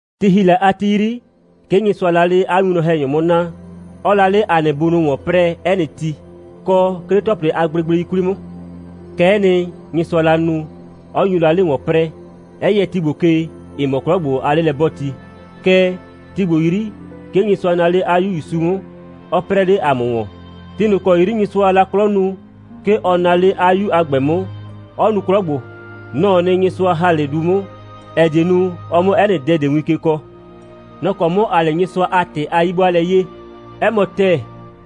Ti ‑hi la a ti 'yri, 'ke Nyɩsʋaa la 'le 'a winwlɔn‑hɛnyʋ 'mʋ naa, 'ɔɔ la 'le ‑a nɩ bunʋ ‑wɔn 'prɛɛ 'ɛ nɩ ti, kɔ 'ke 'le ‑tɔplɩ a gblegblei 'kwli 'mʋ. Kɛ'ɛ nɩ, Nyɩsʋaa la nu, 'ɔ nyu la 'le ‑wɔn 'prɛɛ, 'ɛ yɛ ti ‑gbo ke, ‑ɩ mɔ 'klɔ ‑gbo a 'lelɛ'bɔɔti. Kɛɛ, ti ‑gbo 'yri, 'ke Nyɩsʋa naa 'le 'a 'Yu ‑Yusu 'mʋ, 'ɔ 'prɛɛ 'le ‑a mʋ ‑wɔn. Ti ꞊nʋ ‑kɔ 'yri Nyɩsʋaa la 'klɔ nu, 'ke ɔ naa 'le 'a 'Yu a ‑gbɛ 'mʋ, 'ɔ nu 'klɔ ‑gbo. Nɔ‑ɔ nɩ, Nyɩsʋa ‑ha 'le du 'mʋ, ‑ɛ die nu, ɔ 'mʋ 'ɛ nɩ dɛ ꞊de win ke kɔɔ. Nɔ‑ kɔ 'mʋ ‑aa 'le Nyɩsʋa a ‑tɩ a 'yi'bʋaalɛ 'yee. 'Ɛ mɔ ‑tɛɛ,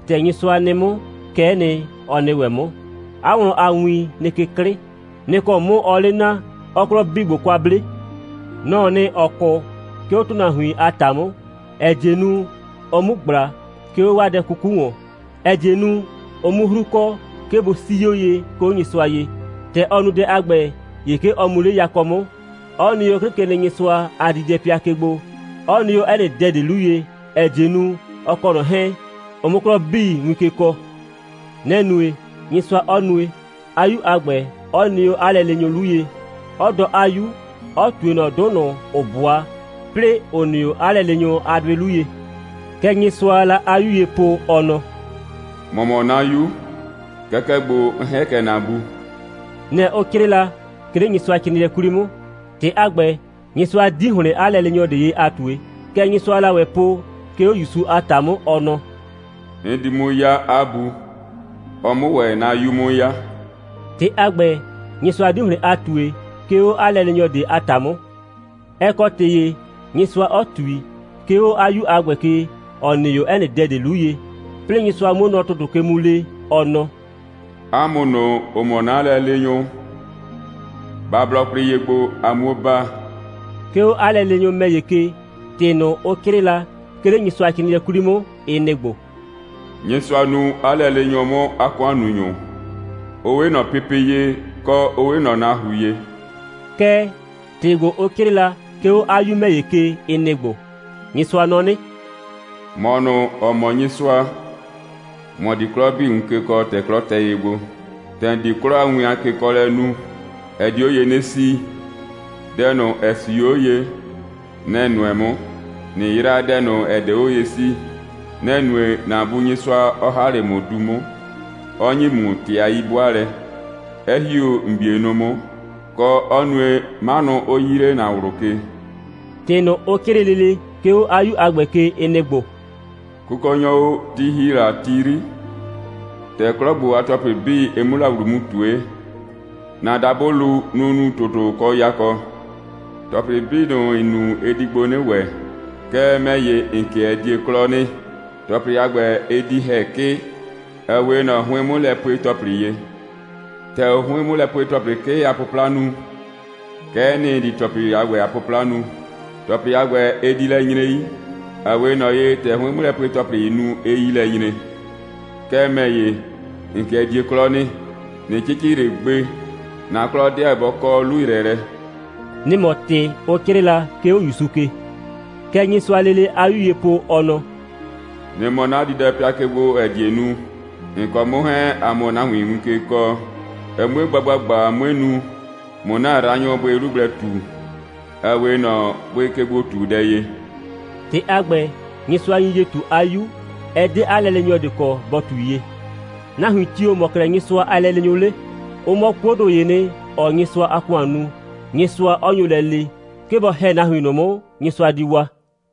‑tɛ Nyɩsʋa nɩ 'mʋ, kɛ'ɛ nɩ, ɔ nɩ ‑wɛ 'mʋ. 'A wlɔn a win nɩ ke 'klɩ. Nɩ‑ kɔ 'mʋ ɔɔ 'le naa, 'ɔɔ 'klɔ 'bii ‑gbo kwa 'ble. Nɔ‑ɔ nɩ, ‑ɔ 'kʋ, 'ke 'o ‑tʋnahuin a ‑ta 'mʋ, ‑ɛ die nu, ɔ 'mu ꞊gbla, 'ke 'o 'waa dɛ 'kuku ‑wɔn, ‑ɛ die nu, ʋ 'mʋ 'hru kɔ, 'ke bʋ 'sii 'o ye, 'ke 'o Nyɩsʋa ye. ‑Tɛ ɔ nu dɛ a ‑gbɛ, ‑ye 'ke ɔ mu 'le yakɔ 'mʋ, 'ɔ nɩ 'o 'Klɩkenɩnyɩsʋa a diidɛpɩa ke gbo, ‑ɔ nɩ 'o 'ɛ nɩ dɛ ꞊de 'lu ye, ‑ɛ die nu, ɔ kɔ ꞊nɔ 'hɛɛn, ʋ 'mʋ 'klɔ 'bii win ke kɔɔ. Nɛ‑ nue, Nyɩsʋa 'ɔ nue, 'a 'Yu a ‑gbɛ 'ɔ nɩ 'o 'a lɛleenyʋ 'lu ye, 'ɔ dɔɔ 'a 'Yu, 'ɔ ꞊tue ꞊nɔ 'dʋ ꞊nʋ, ‑ʋ 'bʋa, 'plɩɩ ‑ʋ nɩ 'o 'a lɛleenyʋ a 'dʋɩ 'lu ye. Kɛ Nyɩsʋaa la 'a 'Yu ye po, ɔ nɔ: «‑Mɔ mɔ 'na 'Yu. Kɛkɛ ‑gbo, 'n ‑hɛ kɛ ‑na Bu.» Nɩ‑ ʋ 'crɩɩ la, 'ke 'le Nyɩsʋacrɩɩnɩɛ 'kwli 'mʋ. ‑Tɩ a ‑gbɛ, Nyɩsʋa 'di ‑hlɩn 'a lɛleenyɔ ꞊de ye a ꞊tue. Kɛ Nyɩsʋaa la ‑wɛ po, 'ke 'o ‑Yusu a ‑ta 'mʋ, ɔ nɔ: «'N di 'mʋ 'ya 'a Bu, ɔ 'mʋ ‑wɛ 'na 'Yu 'mʋ 'ya.» ‑Tɩ a ‑gbɛ, Nyɩsʋa 'di ‑hlɩn a ꞊tue, 'ke 'o 'a lɛleenyɔ ꞊de a ‑ta 'mʋ. Ɛ kɔ ‑tɩ ‑ye, Nyɩsʋa 'ɔ ꞊tui, 'ke 'o 'a 'Yu a ‑gbɛ ke, ‑ɔ nɩ 'o 'ɛ nɩ dɛ ꞊de 'lu ye. 'Plɩɩ Nyɩsʋa 'muo nɔ ‑tʋtʋ ke mu lee, ɔ nɔ: «'A mʋ ꞊nʋ, ‑ʋ mɔ 'na lɛleenyʋ, ba blɔ kwlɩ ye gbo, a 'muo baa.» 'Ke 'o 'a lɛleenyʋ ‑mɛ ‑ye ke, ‑tɩ ꞊nʋ, ʋ 'crɩɩ la, 'ke 'le Nyɩsʋacrɩɩnɩɛ 'kwli 'mʋ, ɩ nɩ‑ ‑gbo: «Nyɩsʋa nuu 'a lɛleenyʋ 'mʋ 'a ‑kʋannunyʋ. Ʋ 'we ꞊nɔ pepe ye, kɔ, 'ʋ 'we ꞊nɔ nahru ye.» Kɛɛ, ‑tɩ ‑gbo, ʋ 'crɩɩ la, 'ke 'o 'a 'Yu ‑mɛ ‑ye ke, ɩ nɩ‑ ‑gbo: «Nyɩsʋa nɔ 'nɩ: ‑Mɔ ꞊nʋ, ‑ɔ mɔ Nyɩsʋa, ‑mɔ di 'klɔ 'bii win ke kɔɔ, ‑tɛ 'klɔ tɛ ye gbo. ‑Tɛ ‑n di 'klɔ a win a kekɔɔlɛ nu, ɛ di 'o ye 'nɩ 'sii. Dɛ ꞊nʋ, ‑ɛ 'sii 'o ye, nɛ‑ ‑n nʋɛ 'mʋ, ꞊nɩ yraa dɛ ꞊nʋ, ‑ɛ 'de 'o ye 'sii. Nɛ‑ nue, ‑na Bu Nyɩsʋa 'ɔ ‑ha 'le ‑mʋ du 'mʋ, 'ɔ ‑nyi ‑mʋ ‑tɩ a 'yi'bʋaalɛ, 'ɛ ‑hi 'o ‑n 'bienʋ 'mʋ, kɔ, 'ɔ nue, 'manʋ 'ʋ 'yii 'le ‑na ꞊wlʋ ke.» ‑Tɩ ꞊nʋ, ʋ 'crɩɩ lele, 'ke 'o 'a 'Yu a ‑gbɛ ke, ɩ nɩ‑ ‑gbo: «Kʋkɔnyɔ o, ti ‑hi la ti 'yri, ‑tɛ 'klɔ ‑gbo a ‑tɔplɩ 'bii, ɩ 'mʋ la ‑wlu mu ꞊tue, ‑na dabʋlu, nʋ‑ nu ‑tʋtʋ kɔ yakɔ. ‑Tɔplɩ 'bii ꞊nʋ, ‑n nu, ɩ di ‑gbo 'nɩ ‑wɛ. Kɛɛ, ‑mɛ ‑ye, ‑n 'kɩɛ die 'klɔ nɩ. ‑Tɔplɩ a ‑gbɛ, ɩ di ‑hɛ 'kɩ, ‑ɛ 'we ꞊nɔ 'hʋɩn'mʋlɛpue‑tɔplɩ ye. ‑Tɛ ʋʋ 'hʋɩn'mʋlɛpue‑tɔplɩ 'kɩ a 'pʋpla nu, kɛ'ɛ nɩ, ‑n di ‑tɔplɩ a ‑gbɛ a 'pʋpla nu. ‑Tɔplɩ a ‑gbɛ, ɩ di lɛ nyre 'yi, ‑ɛ 'we ꞊nɔ ye, ‑tɛ 'hʋɩn'mʋlɛpue‑tɔplɩɩ nu, 'ɩɩ 'yi lɛ nyre. Kɛɛ, ‑mɛ ‑ye, ‑n 'kɩɛ die 'klɔ nɩ. ꞊Nɩ 'cɩcɩ ꞊le gbe. ‑Na 'klɔ 'deɛ bɔ kɔ 'lu‑yrɛɛlɛ.» Nɩ‑ mɔ ‑tɩ, ʋ 'crɩɩ la, 'ke 'o ‑Yusu ke. Kɛ Nyɩsʋaa lele 'a 'Yu ye po, ɔ nɔ: «Nɩ mɔ 'na diidɛpɩa ke gbo, ‑ɛ die nu, ‑n kɔ 'mʋ 'hɛɛn, ‑a 'mʋ nahuin win ke kɔɔ, ɛ 'mue gba ‑gbagba, 'mue nu, ꞊mʋ ‑na yraanyʋ bʋɩ 'lu gblɛ ꞊tu, ‑ɛ 'we ꞊nɔ bʋɩkegbo꞊tudɛ ye.» ‑Tɩ a ‑gbɛ, Nyɩsʋa nyi ye ꞊tu 'a 'Yu. Ɛ 'de 'a lɛleenyɔ ꞊de kɔ, ‑bɔ ꞊tui ye. Nahuin tio‑ mɔ 'klɛɛ Nyɩsʋa a lɛleenyʋ 'le? Ʋ mɔ 'kuodʋ ‑yee nɩ, ‑ɔɔ Nyɩsʋa a ‑kʋan nu, Nyɩsʋa 'ɔ nyo lɛ lee, 'ke bɔ ‑hɛ nahuin ꞊nʋ 'mʋ, Nyɩsʋa di waa.